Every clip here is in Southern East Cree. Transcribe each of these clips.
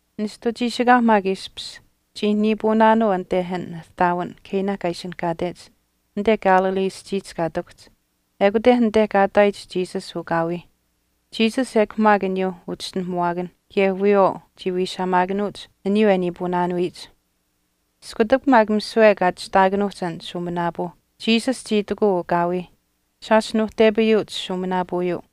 Nishtu chiishikaau maak ishpish chii niipuunaanuu anite an ihtaawin Cana kaa ishinihkaatech anite Galilee aschiihch kaa ihtakuhch. Ekute anite kaa ihtaayich Jesus ukaawiih. Jesus ekw maak aniyuu uchischinuhamuwaakanh kaye wiyawaau chii wiishaamaakanuuch aniyuu e niipuunaanuyich, Iskutak maak misiwe kaa chistaakanuuhch an shuuminaapuu, Jesus chii itikuu ukaawiih, “Shaash nuuhtepayuuch shuuminaapuuyuu.”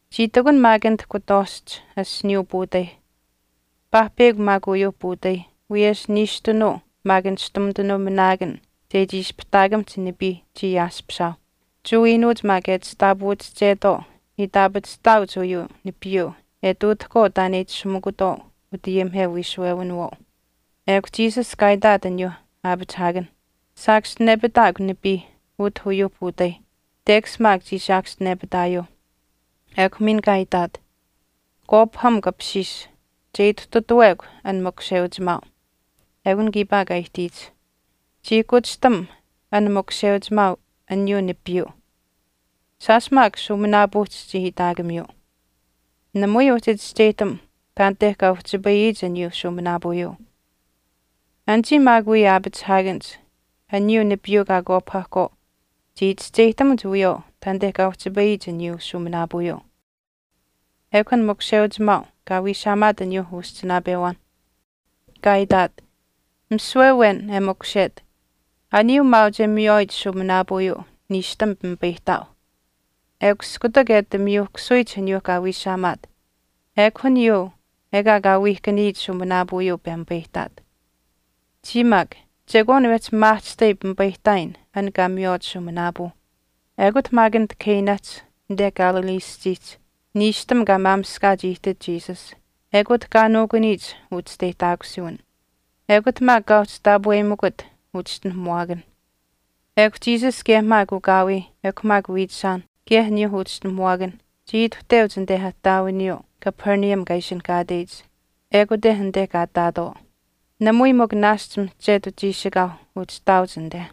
Chii ihtakunh maak anit kutwaashch asiniiyuu puutaih. Paahpeyakw maak uyuuh puutaih wiyesh Niishtunuu maak nishtumitanuu minaakan chechii ispihtaakamihch nipii chii ayaaspishaauh. Jewa iinuuch maak e chishtaapawaachetwaau itaapachihtaauch uyuu nipiiyuu e ihtuutahkwaau taan e itashumikutwaau utayimiheu wiishuwewinawaau. Ekw Jesus kaa itaat aniyuu aapachihaakanh, “Saakaschinepitaakw nipii utah uyuuh puutaih.” Tekash maak chii saakaschinepitaayuuh. Ekw miin kaa itaat, “Kwaapahamukw apishiish che ituhtutuwekw an makusheuchimaau.” Eukun kiipaa kaa ihtiyich. Chii kuchishtam an makusheuchimaau aniyuu nipiiyuu, shaash maak shuuminaapuuhch chii itaakamiyuu. Namui uhchi chischeyihtam taanite kaa uhchipayiyich aniyuu shuuminaapuuyuu. Anichii maak wii aapachihaakanich aniyuu nipiiyuu kaa kwaapahahkwaau chii chischeyihtamuch wiyawaau taanite kaa uhchipayiyich aniyuu shuuminaapuuyuu. Ekw an makusheuchimaau kaa wiishaamaat aniyuu uschinaapewaan, kaa itaat, “Misiwe awen e makushet, aniyuu maauch e miywaayich shuuminaapuuyuu niishtam pimipayihtaau, ekw iskutak e ati miyuhkasuyich aniyuu kaa wiishaamaat, ekw aniyuu ekaa kaa wiihkaniyich shuuminaapuuyuu pemipayihtaat. Chiya maak chekwaan wehchi maahchishtai pimipayihtaayin an kaa miywaach shuuminaapuu.” Ekut maak anit Canahch anite Galilee aschiihch, niishtam kaa maamishkaach ihtit Jesus, ekut kaa nuukuniyich uchisteyihtaakusuwin. Ekut maak kaa uhchi taapweyimikut uchischinuhamuwaakanh. Ekw Jesus kaye maak ukaawiih ekw maak wiichishaanh kaye aniyuu uchischinuhamuwaakanh chii ituhteuch anite ihtaawiniyuu Capernaum kaa ishinihkaateyich, ekute anite kaa ihtaatwaau. Namui mikw naashch mihchetu chiishikaau uhchi ihtaauch anite.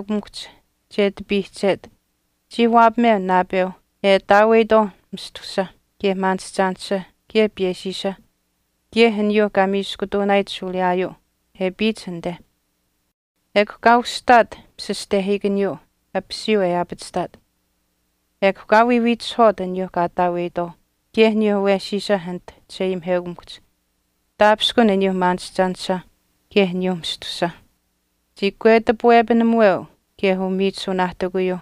Anite maak chisheayimiheukamikuhch che ati piihchet, chii waapameu naapeuh e ataaweyitwaauh mistusa kaye maanishchaanisha kaye piyeshiisha, kaye aniyuu kaa miishkutuunaayich shuuliyaau e apiyich anite. Ekw kaa ushihtaat pishishtehiikaniyuu apisiyuu e aapachihtaat, ekw kaa wiiwiitishihwaat aniyuuh kaa ataaweyitwaau kaye aniyuu awesiisa anit chisheayimiheukamikuhch, taapishkun aniyuu maanishchaanisha kaye aniyuu mistusa. Chii kwetipuwepinamuweu kaye umiichisuunaahtikuyuuh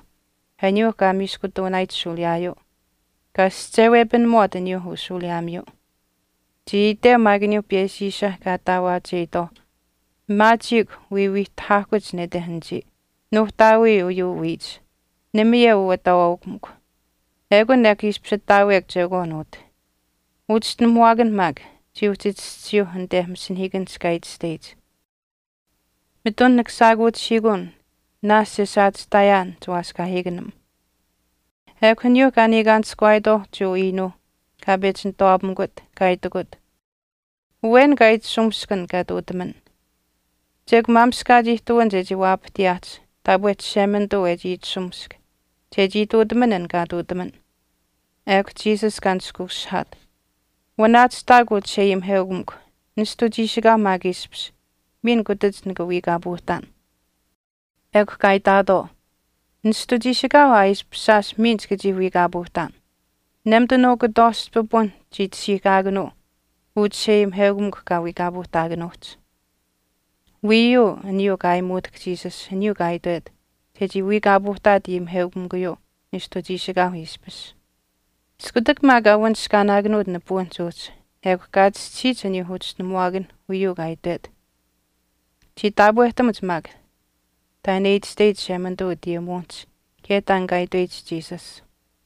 aniyuu kaa miishkutuunamiyich shuuliyaayuu, kaa aschewepinamuwaat aniyuu ushuuliyaamiyuu. Chii iteu maak aniyuu piyeshiisha kaa ataawaacheyitaauh, “Maachiikw wiiwiihtahaahkuch nete anichii. Nuuhtaawii uyuu wiichi, namayeu uu ataawaaukamikw. Ekun ekw ishpish ataawekw chekwaan utah.” Uchischinuhamuwaakanh maak chii uhchi chischisiyuuh anite masinahiikanihch kaa itashteyich, Mitun nika shaakuuchihiikuun naashch e saachihtaayaan chiwaaskaahiikanim. Ekw aniyuuh kaa niikaanishkuwaayitwaauh Jewa iinuuh kaa pechi nituwaapamikut, kaa itikut, “Awen kaa itashumisk an kaa ihtuutaman, chekw maamishkaach ihtuwin chechii waapahtiyaahch taapwe Chishemanituu e chii itashumisk chechii ihtuutaman an kaa ihtuutaman.” Ekw Jesus kaa ishi nishkuushihaat, “Wanaachihtaakw uu Chisheayimiheukamikw, nishtu chiishikaauh maak ishpish miin kutach nika wiikaapuuhtaan.” Ekw kaa itaatwaau, “Nishtu chiishikaauh aa ishpish shaash miin chika chii wiikaapuuhtaan. Nemitanuu kutwaashch pipun chii tashiihkaakanuu uu chisheayimiheukamikw kaa wiikaapuuhtaakanuuhch.” Wiiyuu aniyuu kaa ayimitutahk Jesus aniyuu kaa itwet chechii wiikaapuuhtaat ayimiheukamikuyuu nishtu chiishikaauh ishpish. Iskutak maak kaa wanishkaanaakanuut nipuwinihch uhchi, ekw kaa chischisiyich aniyuu uchischinuhamuwaakanh uyuu kaa itwet. Chii taapwehtamuch maak taan e itashteyich Chishemanituu utayimuwinihch kaye taan kaa itweyich Jesus.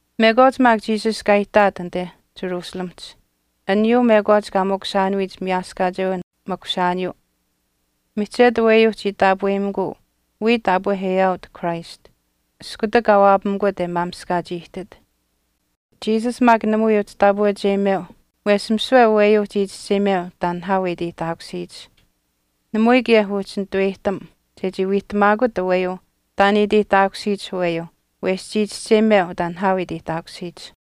Mekwaach maak Jesus kaa ihtaat anite Jerusalemihch aniyuu mekwaach kaa makushaanuyich miyaaskaacheu makushaaniyuu, mihchetu aweyuu chii taapweyimikuu wiya taapwe e aawiyit Christ iskutak kaa waapamikut e maamishkaach ihtit. Jesus maak namui uhchi taapweucheyimeu wesh misiwe aweyuu chii chischeyimeu taan nihaau e iteyihtaakusiyich. Namui kaye uhchi nituweyihtam chechii wiihtamaakut aweyuu taan e iteyihtaakusiyich aweyuu wesh chii chischeyimeu taan nihaau e iteyihtaakusiyich.